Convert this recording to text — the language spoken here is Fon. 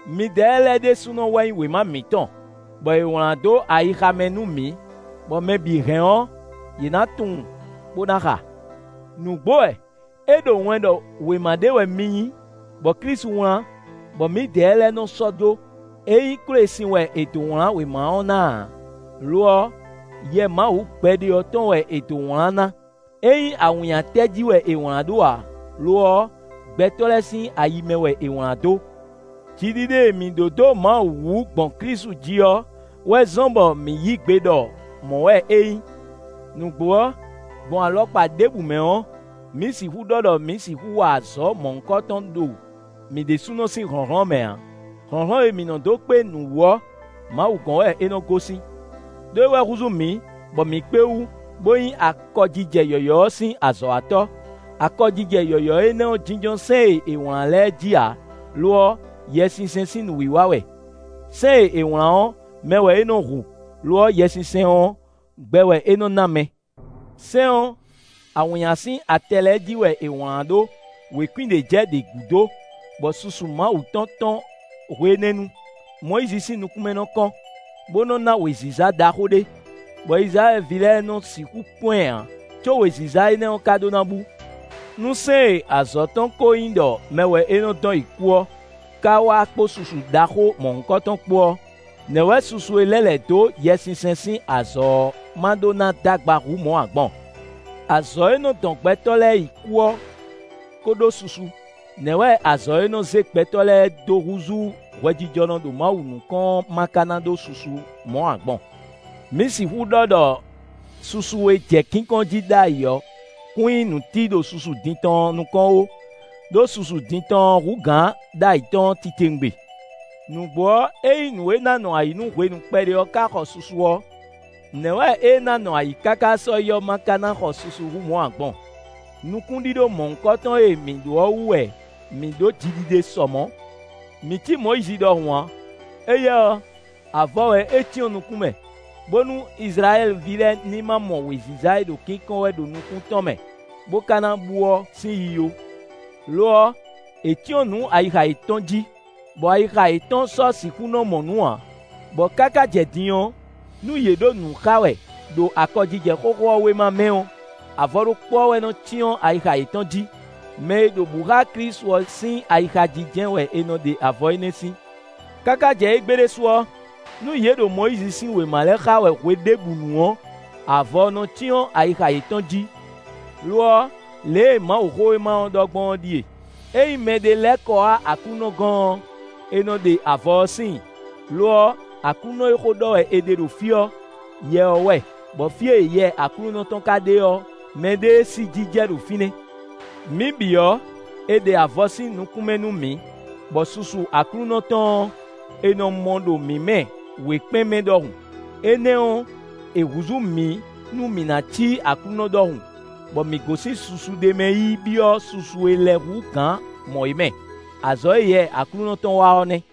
Midɛɛ lɛ́ɛ ɖésúnɔ wɛ nyí wěma mǐtɔn, bɔ è wlán dó ayixa mɛ nú mǐ, bɔ mɛ bǐ hɛn ɔ́, yě nǎ tunwun, bó ná xa. Nǔgbó wɛ! É ɖo wɛn ɖɔ wěma ɖé wɛ mi nyí, bɔ Klísu wlán, bɔ mǐdɛɛ lɛ́ɛ nɔ sɔ́ jó. É nyí kwélesin wɛ è dǒ wlán wěma ɔ́ ná ǎ; lo ɔ́, Yɛ Mawu gbɛɖe ɔ́ tɔn wɛ è dǒ wlán ná; é nyí awǐnnyatɛ jí wɛ è wlǎn ɖó ǎ; lo ɔ́, gbɛtɔ́ lɛ́ɛ sín ayi mɛ wɛ è wlǎn dó. Jiɖiɖe e mǐ ɖó dó Mawu wú gbɔn Klísu jí ɔ́ wɛ zɔ́n bɔ mǐ yí gbe ɖɔ mɔ̌ wɛ é nyí. Nǔgbó ɔ́, gbɔn alɔkpa ɖěbǔ mɛ ɔ́, mǐ sixú ɖɔ ɖɔ mǐ sixú wa azɔ̌ mɔ̌hunkɔtɔn ɖo mǐ ɖésúnɔ sín hlɔ̌nhlɔ́n mɛ ǎ. Hlɔ̌nhlɔ́n e mǐ nɔ dó kpé nǔ wú ɔ́, Mawu gɔ́n wɛ é nɔ gosín. Đó é wɛ húzú mǐ, bɔ mǐ kpé wú, bó nyí akɔjijɛ yɔ̌yɔ́ ɔ́ sín azɔ̌watɔ́. Akɔjijɛ yɔ̌yɔ́ énɛ́ jínjɔ́n sɛ́n e è wlán lɛ́ɛ jí ǎ; lo ɔ́, Yɛsinsɛn sín nǔwiwa wɛ. Sɛ́n e è wlán ɔ́, mɛ wɛ é nɔ hu; lo ɔ́ Yɛsinsɛn ɔ́, gbɛ wɛ é nɔ ná mɛ. Sɛ́n ɔ́, awǐnnya sín atɛ lɛ́ɛ jí wɛ è wlǎn ɖó, wěkwín ɖě jɛ ɖě gúdo, bɔ susu Mawu tɔn tɔ́n hwe énɛ́ nu. Mɔyízi sín nukún mɛ nɔ kɔ́n, bó nɔ ná wěziza ɖaxó ɖé, bɔ Izlayɛ́li ví lɛ́ɛ nɔ sixú kpɔ́n ɛ ǎ, có wěziza énɛ́ ɔ́ ka ɖó ná bú. Nú sɛ́n e azɔ̌ tɔn ɔ́ ko nyí ɖɔ mɛ wɛ é nɔ dɔn yi kú ɔ́, ka wá kpó susu ɖaxó mɔ̌hunkɔtɔn kpó ɔ́, nɛ̌ wɛ susu e lɛ́ lɛ̌ dó Yɛsinsɛn sín azɔ̌ ɔ́ ma ɖó ná d'agba hú mɔ̌ ǎ gbɔn? Azɔ̌ e nɔ dɔn gbɛtɔ́ lɛ́ɛ yi kú ɔ́ ko ɖó susu; nɛ̌ wɛ azɔ̌ e nɔ zé gbɛtɔ́ lɛ́ɛ dó húzú hwɛjijɔnɔ ɖo Mawu nukɔn ɔ́ ma ká ná ɖó susu hú mɔ̌ ǎ gbɔn? Mǐ sixú ɖɔ ɖɔ susu e jɛ kínkɔ́n jí ɖ'ayǐ ɔ́ kún nyí nǔtí ɖo susu din tɔn ɔ́ nukɔn ó; ɖó susu din tɔn ɔ́ hú gǎn ɖ'ayǐ tɔn ɔ́ titewungbe. Nǔgbó ɔ́, ényí nǔ e ná nɔ ayǐ nú hwenu kpɛɖé ɔ́ ka xɔ susu ɔ́, nɛ̌ wɛ ée ná nɔ ayǐ káká sɔ́yi ɔ́ ma ká ná xɔ susu hú mɔ̌ ǎ gbɔn? Nukúnɖíɖó mɔ̌hunkɔtɔn e mǐ ɖó ɔ́ wú wɛ mǐ ɖó jiɖiɖe sɔ mɔ̌. Mǐ cí Mɔyízi ɖɔhun ǎ; éyɛ́ ɔ́, avɔ wɛ é cyɔ́n nukún mɛ, bónú Izlayɛ́li ví lɛ́ɛ ní ma mɔ wěziza e ɖo kínkɔ́n wɛ ɖo nukún tɔn mɛ, bó ka ná bú ɔ́ sín yiyi ó. Lo ɔ́, è cyɔ́n nǔ ayixa yětɔn jí, bɔ ayixa yětɔn sɔ́ sixú nɔ mɔ nǔ ǎ; bɔ káká jɛ din ɔ́, nú yě ɖo nǔ xa wɛ ɖo akɔjijɛ xóxó ɔ́ wéma mɛ ɔ́, avɔ ɖokpó ɔ́ wɛ nɔ cyɔ́n ayixa yětɔn jí. Mɛ e ɖo bǔ xá Klísu ɔ́ sín ayixa jí jɛ́n wɛ è nɔ ɖe avɔ énɛ́ sín. Káká jɛ égbé ɖésú ɔ́, nú yě ɖo Mɔyízi sín wěma lɛ́ɛ xa wɛ hweɖěbǔnu ɔ́, avɔ ɔ́ nɔ cyɔ́n ayixa yětɔn jí. Lo ɔ́, lě e Mawuxówéma ɔ́ ɖɔ gbɔn ɔ́ ɖíe: “Ényí mɛɖé lɛ́ kɔ wá Aklúnɔ gɔ́n ɔ́, è nɔ ɖe avɔ ɔ́ síin.” Lo ɔ́, Aklúnɔ e xó ɖɔ wɛ è ɖe ɖo fí ɔ́, Yɛ ɔ́ wɛ; bɔ fí e Yɛ Aklúnɔ tɔn ka ɖe ɔ́, mɛɖée sí jijɛ ɖo fínɛ́. Mǐ bǐ ɔ́, è ɖe avɔ sín nukún mɛ nú mǐ, bɔ susu Aklúnɔ tɔn ɔ́, è nɔ mɔ ɖo mǐ mɛ wěkpɛ́n mɛ ɖɔhun; énɛ́ ɔ́, è húzú mǐ nú mǐ ná cí Aklúnɔ ɖɔhun, bɔ mǐ gosín susu ɖé mɛ yi byɔ́ susu e lɛ́ hú gǎn mɔ̌ é mɛ. Azɔ̌ e Yɛ Aklúnɔ tɔn wa ɔ́ nɛ́.